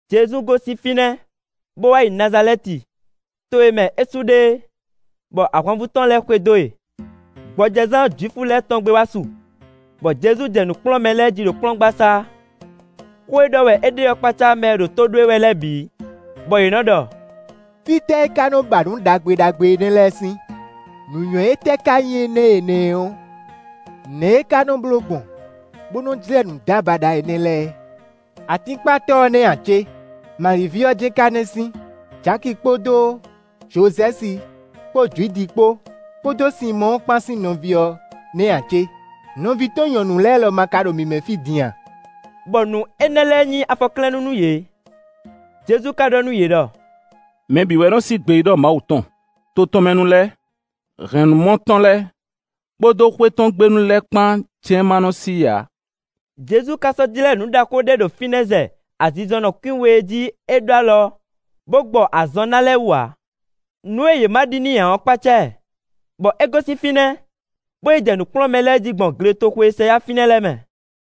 Jezu gosín fínɛ́, bó wá yi Nazalɛ́ti, to e mɛ é su ɖe é, bɔ ahwanvú tɔn lɛ́ɛ xwedó e. Gbɔjɛzán Jwifu lɛ́ɛ tɔn gbe wá su, bɔ Jezu jɛ nǔ kplɔ́n mɛ lɛ́ɛ jí ɖo kplɔ́ngbasá; xó e ɖɔ wɛ é ɖe ɔ́ kpácá mɛ e ɖo tó ɖó e wɛ lɛ́ɛ bǐ, bɔ yě nɔ́ ɖɔ: “Fítɛ́ é ká ba nǔ ɖagbe ɖagbe énɛ́ lɛ́ɛ sín? Nǔnywɛ́ tɛ́ ká nyí énɛ́ e è nǎ ɛ ɔ́? Nɛ̌ wɛ é ká nɔ́ bló gbɔn, bó nɔ́ jlɛ́ nǔdábaɖa énɛ́ lɛ́ɛ? Atínkpatɔ́ ɔ́ nɛ́ ǎ cé? Mali ví ɔ́ jɛ́n ká nɛ́ sín! Jaki kpódó Jozɛ́si kpó Judi kpó, kpódó Sinmɔ́ɔ kpán sín nɔví ɔ́ nɛ́ ǎ cé? Nɔví tɔn nyɔ̌nu lɛ́ɛ lɔ ma ka ɖo mǐ mɛ fí din a?” Bɔ nǔ énɛ́ lɛ́ɛ nyí afɔklɛ́nnú nú yě. Jezu ka ɖɔ nú yě ɖɔ: “Mɛ bǐ wɛ nɔ́ sí gbeyíɖɔ Mawu tɔn; to tɔn mɛ nu lɛ́ɛ, hɛ̌nnumɔ tɔn lɛ́ɛ, kpódó xwé tɔn gbe nu lɛ́ɛ kpán jɛ́n ma nɔ́ sí i ǎ.” Jezu ka sɔ́ jlɛ́ nǔ ɖaxó ɖé ɖo fínɛ́ zɛ azinzɔnnɔ kwín we e jí é ɖó alɔ, bó gbɔ azɔn ná lɛ́ɛ wú ǎ. Nǔ e yě ma ɖi n'i ǎ ɔ́ kpácá ɛ, bɔ é gosín fínɛ́, bó yi jɛ nǔ kplɔ́n mɛ lɛ́ɛ jí gbɔn gletoxo e sɛ yá fínɛ́ lɛ́ɛ mɛ.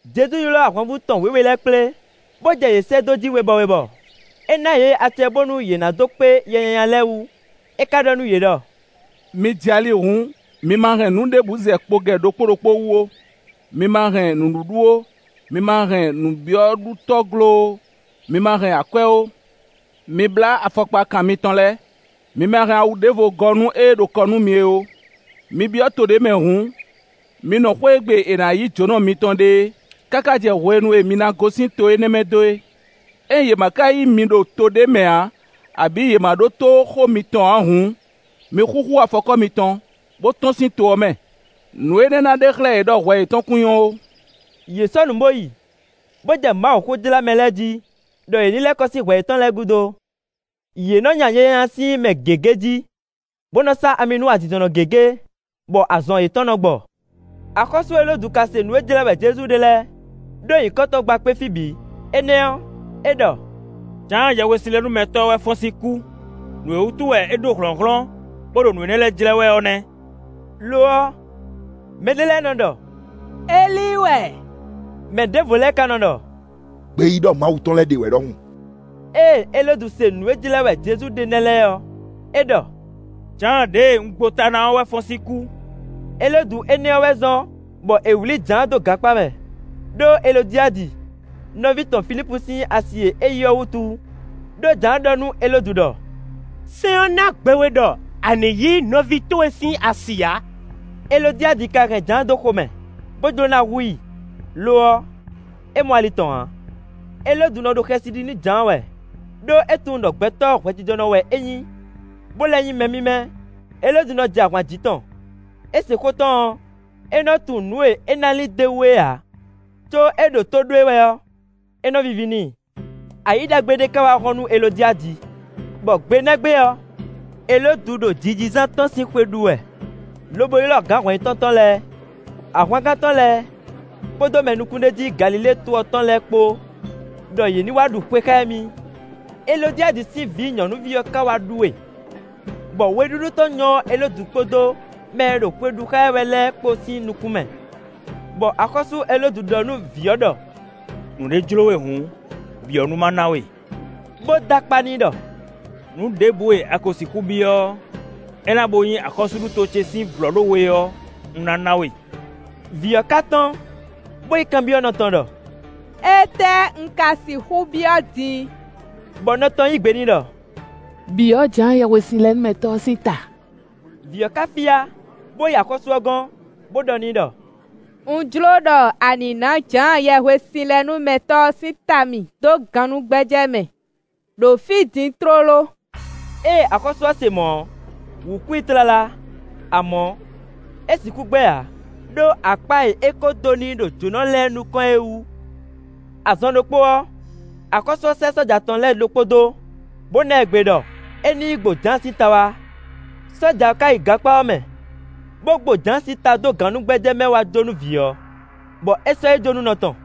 Jezu ylɔ́ ahwanvú tɔn wěwe lɛ́ɛ kplé, bó jɛ yě sɛ́ dó jí webɔ webɔ. É ná yě acɛ bónú yě ná dó kpé yɛ nyanya lɛ́ɛ wú. É ka ɖɔ nú yě ɖɔ: “Mi jɛ ali hǔn, mi ma hɛn nǔ ɖěbǔ zɛ kpogɛ ɖokpó ɖokpó wú ó, mi ma hɛn nǔɖuɖu ó, mi ma hɛn nǔbyɔ́ɖutɔ́glo ó, mi ma hɛn akwɛ́ ó. Mi blá afɔkpakan mitɔn lɛ́ɛ, mi ma hɛn awu ɖěvo gɔ́ nú ée ɖo kɔ nú mi é ó. “Mi byɔ́ to ɖé mɛ hǔn, mi nɔ xwé e gbe è nǎ yí jǒnɔ mitɔn ɖe é, káká jɛ hwenu e mi ná gosín to énɛ́ mɛ dó é. Ényí yě ma ka yí mi ɖo to ɖé mɛ ǎ, abǐ yě ma ɖótó xó mitɔn ǎ hǔn, mi xúxú afɔkɔ́ mitɔn, bó tɔ́n sín to ɔ́ mɛ; nǔ énɛ́ ná ɖe xlɛ́ yě ɖɔ hwɛ yětɔn kún nyɔ́ ó.” Yě sɔ́ nǔ bó yi, bó jɛ Mawuxó jlá mɛ lɛ́ɛ jí, ɖɔ yě ní lɛ́ kɔ sín hwɛ yětɔn lɛ́ɛ gúdo. Yě nɔ́ nya yɛ nyanya sín mɛ gěgé jí, bó nɔ́ sá ami nú azinzɔnnɔ gěgé, bɔ azɔn yětɔn nɔ́ gbɔ. Axɔ́sú Elódu ka se nǔ e jlɛ́ wɛ Jezu ɖe lɛ́ɛ, ɖó nyǐkɔ tɔn gba kpé fí bǐ. Énɛ́ ɔ́, é ɖɔ: “Jǎan Yɛhwesinlɛnúmɛtɔ́ ɔ́ wɛ fɔ́n sín kú, nǔ e wútu wɛ é ɖó hlɔ̌nhlɔ́n, bó ɖo nǔ énɛ́ lɛ́ɛ jlɛ́ wɛ ɔ́ nɛ́.” Lo ɔ́, mɛɖé lɛ́ɛ nɔ́ ɖɔ: “Elíi wɛ.” Mɛ ɖěvo lɛ́ɛ ká nɔ́ ɖɔ: “Gbeyíɖɔ Mawu tɔn lɛ́ɛ ɖě wɛ ɖɔhun.” Ée Elódu se nǔ e jlɛ́ wɛ Jezu ɖe nɛ́ lɛ́ɛ ɔ́, é ɖɔ: “Jǎan ɖěe un gbo ta ná ɔ́ wɛ fɔ́n sín kú.” Elódu énɛ́ ɔ́ wɛ zɔ́n bɔ è wlǐ Jǎan dó gankpá mɛ, ɖó Elodiadi, nɔví tɔn Filípu sín asi e é yí ɔ́ wútu. Đó Jǎan ɖɔ nú Elódu ɖɔ: “Sɛ́n ɔ́ ná gbe we ɖɔ a nǐ yí nɔví towe sín asi ǎ.” Elodiadi ka hɛn Jǎan xomɛ, bó jló ná hu i; lo ɔ́, é mɔ ali tɔn ǎ. Elódu nɔ ɖo xɛsi ɖi nú Jǎan wɛ, ɖó é tunwun ɖɔ gbɛtɔ́ hwɛjijɔnɔ wɛ é nyí, bó lɛ́ nyí mɛ mímɛ́. Elódu nɔ jɛ ahwan jǐ tɔn; é se xó tɔn ɔ́, é nɔ́ tunwun nǔ e é ná lin d'é wú é ǎ, có é ɖo tó ɖó e wɛ ɔ́, é nɔ́ víví n'i. Ayǐ ɖagbe ɖé ká wá hɔ́n nú Elodiadi, bɔ gbe nɛ́ gbe ɔ́, Elódu ɖo jijizán tɔn sín xwe ɖu wɛ, lobo ylɔ́ gǎn hɔn-yitɔ́ tɔn lɛ́ɛ, ahwangán tɔn lɛ́ɛ, kpódó mɛ nukúnɖéjí Galilée to ɔ́ tɔn lɛ́ɛ kpó ɖɔ yě ní wá ɖu xwe xá émí. Elodiadi sín vǐ nyɔ̌nuví ɔ́ ka wá ɖú we, bɔ weɖúɖú tɔn nyɔ́ Elódu kpódó mɛ e ɖo xwe ɖu xá ɛ wɛ lɛ́ɛ kpó sín nukún mɛ, bɔ axɔ́sú Elódu ɖɔ nú vǐ ɔ́ ɖɔ: “Nǔɖé jló we hǔn, byɔ̌ nú má ná we.” Bó dó akpá n'i ɖɔ: “Nǔ ɖěbǔ e a ko sixú byɔ́ ɔ́, é ná bo nyí axɔ́súɖuto ce sín vlɔ̌ɖówe ɔ́, un ná ná we.” Vǐ ɔ́ ká tɔ́n, bó yi kanbyɔ́ nɔ tɔn ɖɔ: “Étɛ́ un ka sixú byɔ́ din?” Bɔ nɔ tɔn yí gbe n'i ɖɔ: “Byɔ̌ Jǎan Yɛhwesinlɛnúmɛtɔ́ ɔ́ sín ta.” Vǐ ɔ́ ká fyá, bó yi axɔ́sú ɔ́ gɔ́n, bó ɖɔ n'i ɖɔ: “Un jló ɖɔ a nǐ ná Jǎan Yɛhwesinlɛnúmɛtɔ́ sín ta mì dó gannúgbɛ́jɛ́ mɛ ɖo fí din tlóló.” Ée axɔ́sú ɔ́ se mɔ̌ ɔ́, wǔ kú i tlala, amɔ̌, é sixú gbɛ́ ǎ, ɖó akpá e é kó dó n'i ɖo jǒnɔ lɛ́ɛ nukɔn é wú. Azɔn ɖokpó ɔ́, axɔ́sú ɔ́ sɛ́ sɔ́ja tɔn lɛ́ɛ ɖokpó dó, bó ná ɛ gbe ɖɔ é ní yi gbo Jǎan sín ta wá. Sɔ́ja ɔ́ ká yi gankpá ɔ́ mɛ, bó gbo Jǎan sín ta dó gannúgbɛ́jɛ́ mɛ wá jó nú vǐ ɔ́, bɔ é sɔ́ yi jó nú nɔ tɔn.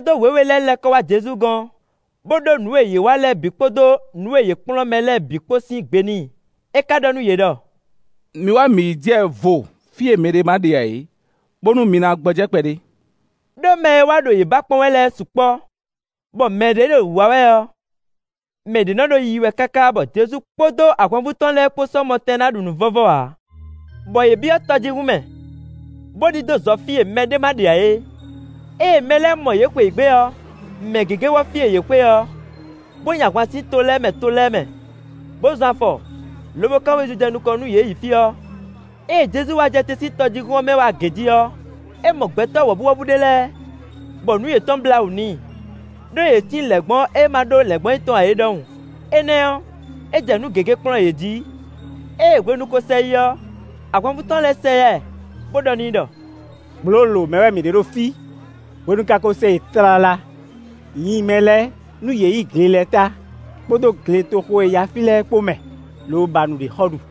Mɛsɛ́dó wěwe lɛ́ɛ lɛ́ kɔ wá Jezu gɔ́n, bó ɖó nǔ e yě wa lɛ́ɛ bǐ kpódó nǔ e yě kplɔ́n mɛ lɛ́ɛ bǐ kpó sín gbe n'i. É ka ɖɔ nú yě ɖɔ: “Mi wá mǐ ní jɛ vo fí e mɛɖé ma ɖe ǎ é, bónú mi ná gbɔjɛ́ kpɛɖé.” Đó mɛ e wá ɖo yě ba kpɔ́n wɛ lɛ́ɛ sukpɔ́, bɔ mɛ ɖě ɖo wǐwá wɛ ɔ́, mɛ ɖě nɔ́ ɖo yiyi wɛ káká bɔ Jezu kpódó ahwanvú tɔn lɛ́ɛ kpó sɔ́ mɔ tɛn ná ɖu nǔ vɔ́vɔ́ ǎ. Bɔ yě byɔ́ tɔjíhún mɛ, bó ɖidó zɔ fí e mɛɖé ma ɖe ǎ é. Ée mɛ lɛ́ɛ mɔ yě xweyǐgbe ɔ́, mɛ gěgé wɔ́ fí e yě xwe ɔ́, bó nyi ahwan sín to lɛ́ɛ mɛ to lɛ́ɛ mɛ, bó zɔn afɔ, lobo kán wezun jɛ nukɔn nú yě yi fí ɔ́. Ée Jezu wá jɛ te sín tɔjíhún ɔ́ mɛ wá agě jí ɔ́, é mɔ gbɛtɔ́ wɔ̌buwɔ́bú ɖé lɛ́ɛ, bɔ nǔ yětɔn blá wǔ n'i; ɖó yě cí lɛ̌ngbɔ́ e má ɖó lɛ̌ngbɔ́nyitɔ́ ǎ é ɖɔhun. Énɛ́ ɔ́, é jɛ nǔ gěgé kplɔ́n yě jí. Ée hwenu ko sɛ yi ɔ́, ahwanvú tɔn lɛ́ɛ sɛ yá ɛ, bó ɖɔ n'i ɖɔ: “Gblǒlǒ mɛ wɛ mǐ ɖe ɖo fí, hwenu ka ko sɛ yi tlala; nyi mɛ lɛ́ɛ, nú yě yi gle lɛ́ɛ ta kpódó gletoxo e yá fí lɛ́ɛ kpó mɛ, lobo ba nǔɖé xɔ ɖu.”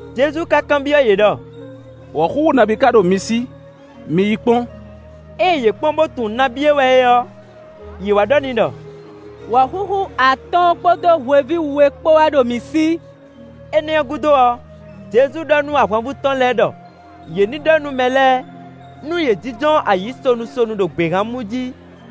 Jezu ka kanbyɔ́ yě ɖɔ: “Wɔ̌xúxú nabí ka ɖo mi sí? Mi yi kpɔ́n.” Ée yě kpɔ́n bó tunwun nabí e wɛ é ɔ́, yě wá ɖɔ n'i ɖɔ: “Wɔ̌xúxú atɔ́ɔ́n kpódó hweví we kpó wɛ ɖo mǐ sí.” Énɛ́ ɔ́ gúdo ɔ́, Jezu ɖɔ nú ahwanvú tɔn lɛ́ɛ ɖɔ yě ní ɖɔ nú mɛ lɛ́ɛ nú yě jínjɔ́n ayǐ sonu sonu ɖo gběhan mú jí.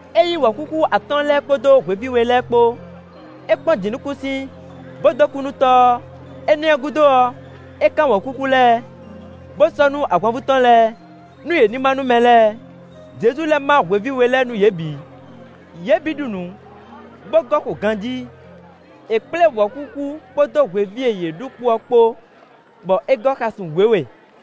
É yí wɔ̌xúxú atɔ́ɔ́n lɛ́ɛ kpódó hweví we lɛ́ɛ kpó; é kpɔ́n jǐnukúnsin, bó dó kú nú Tɔ́ ɔ́. Énɛ́ ɔ́ gúdo ɔ́, é kán wɔ̌xúxú lɛ́ɛ, bó sɔ́ nú ahwanvú tɔn lɛ́ɛ, nú yě ní má nú mɛ lɛ́ɛ. Jezu lɛ́ má hweví we lɛ́ɛ nú yě bǐ. Yě bǐ ɖu nǔ, bó gɔ́ xo ganjí. È kplé wɔ̌xúxú kpódó hweví e yě ɖu kpo ɔ́ kpó, bɔ é gɔ́ xasun wěwe.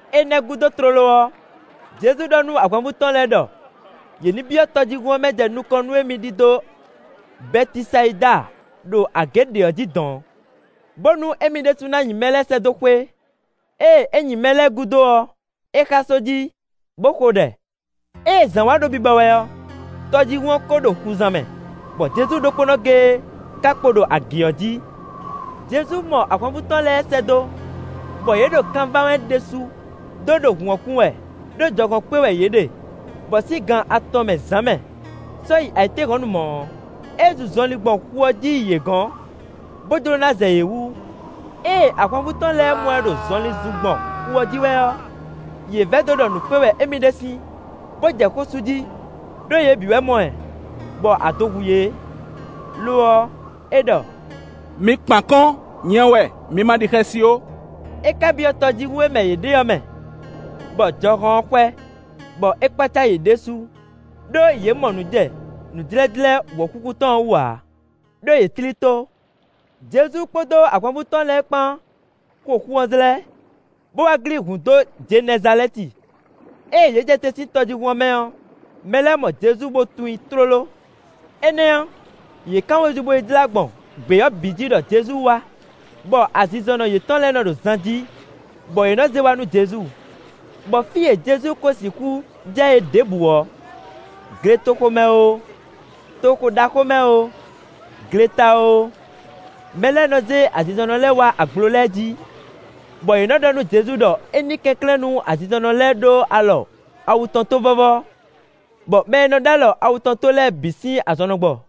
Énɛ́ gúdo tlóló ɔ́, Jezu ɖɔ nú ahwanvú tɔn lɛ́ɛ ɖɔ yě ní byɔ́ tɔjíhún ɔ́ mɛ jɛ nukɔn nú émí ɖidó Bɛtisayida ɖo agě ɖe ɔ́ jí dɔ̌n, bónú émí ɖésú ná nyi mɛ lɛ́ɛ sɛ́ dó xwé. Ée é nyi mɛ lɛ́ɛ gúdo ɔ́, é xá só jí, bó xo ɖɛ. Ée zǎn wá ɖo bibɔ wɛ ɔ́, tɔjíhún ɔ́ ko ɖo xuzan mɛ, bɔ Jezu ɖokpónɔ géé ka kpo ɖo agě ɔ́ jí. Jezu mɔ ahwanvú tɔn lɛ́ɛ sɛ́ dó, bɔ yě ɖo kan ván wɛ ɖésú, dó ɖo hǔn ɔ́ kun wɛ, ɖó jɔhɔn kpé wɛ yě ɖe; bɔ, sín gan atɔn mɛ zǎn mɛ, sɔ́ yi ayǐtéhɔ̌nnu mɔ̌ ɔ́, é zun zɔnlin gbɔn xu ɔ́ jí yi yě gɔ̌n, bó jló ná zɛ yě wú. Ée ahwanvú tɔn lɛ́ɛ mɔ ɛ ɖo zɔnlin zun gbɔn xu ɔ́ jí wɛ ɔ́, yě vɛdó ɖɔ nǔ kpé wɛ émí ɖe sín, bó jɛ xó sú jí; ɖó yě bǐ wɛ mɔ ɛ, bɔ ado hu yě. Lo ɔ́, é ɖɔ: “Mi kpan akɔ́n, nyɛ wɛ; mi ma ɖi xɛsi ó.” É ka byɔ́ tɔjíhún e mɛ yě ɖe ɔ́ mɛ, bɔ jɔhɔn ɔ́ xwɛ, bɔ é kpácá yě ɖésú; ɖó yě mɔ nǔ jɛ nǔjlɛ́jlɛ́ wɔ̌xúxú tɔn ɔ́ wú ǎ; ɖó yě tlí tó. Jezu kpódó ahwanvú tɔn lɛ́ɛ kpán xo xu ɔ́ zlɛ́, bó wá glín hǔn dó Jenɛzalɛ́ti. Ée yě jɛ te sín tɔjíhún ɔ́ mɛ ɔ́, mɛ lɛ́ɛ mɔ Jezu bó tunwun i tlóló. Énɛ́ ɔ́, yě kán wezun bo yi jlá gbɔn gbě ɔ́ bǐ jí ɖɔ Jezu wá, bɔ azinzɔnnɔ yětɔn lɛ́ɛ nɔ ɖo zan jí, bɔ yě nɔ zé wá nú Jezu. Bɔ fí e Jezu ko sixú jɛ é ɖěbǔ ɔ́, gletoxo mɛ oo, toxo ɖaxó mɛ oo, gleta oo, mɛ lɛ́ɛ nɔ zé azinzɔnnɔ lɛ́ɛ wá agblo lɛ́ɛ jí, bɔ yě nɔ́ ɖɔ nú Jezu ɖɔ é ní kɛnklɛ́n nú azinzɔnnɔ lɛ́ɛ ɖó alɔ awu tɔn tó vɔ́vɔ́, bɔ mɛ e nɔ ɖó alɔ awu tɔn tó lɛ́ɛ bǐ sín azɔn nɔ gbɔ.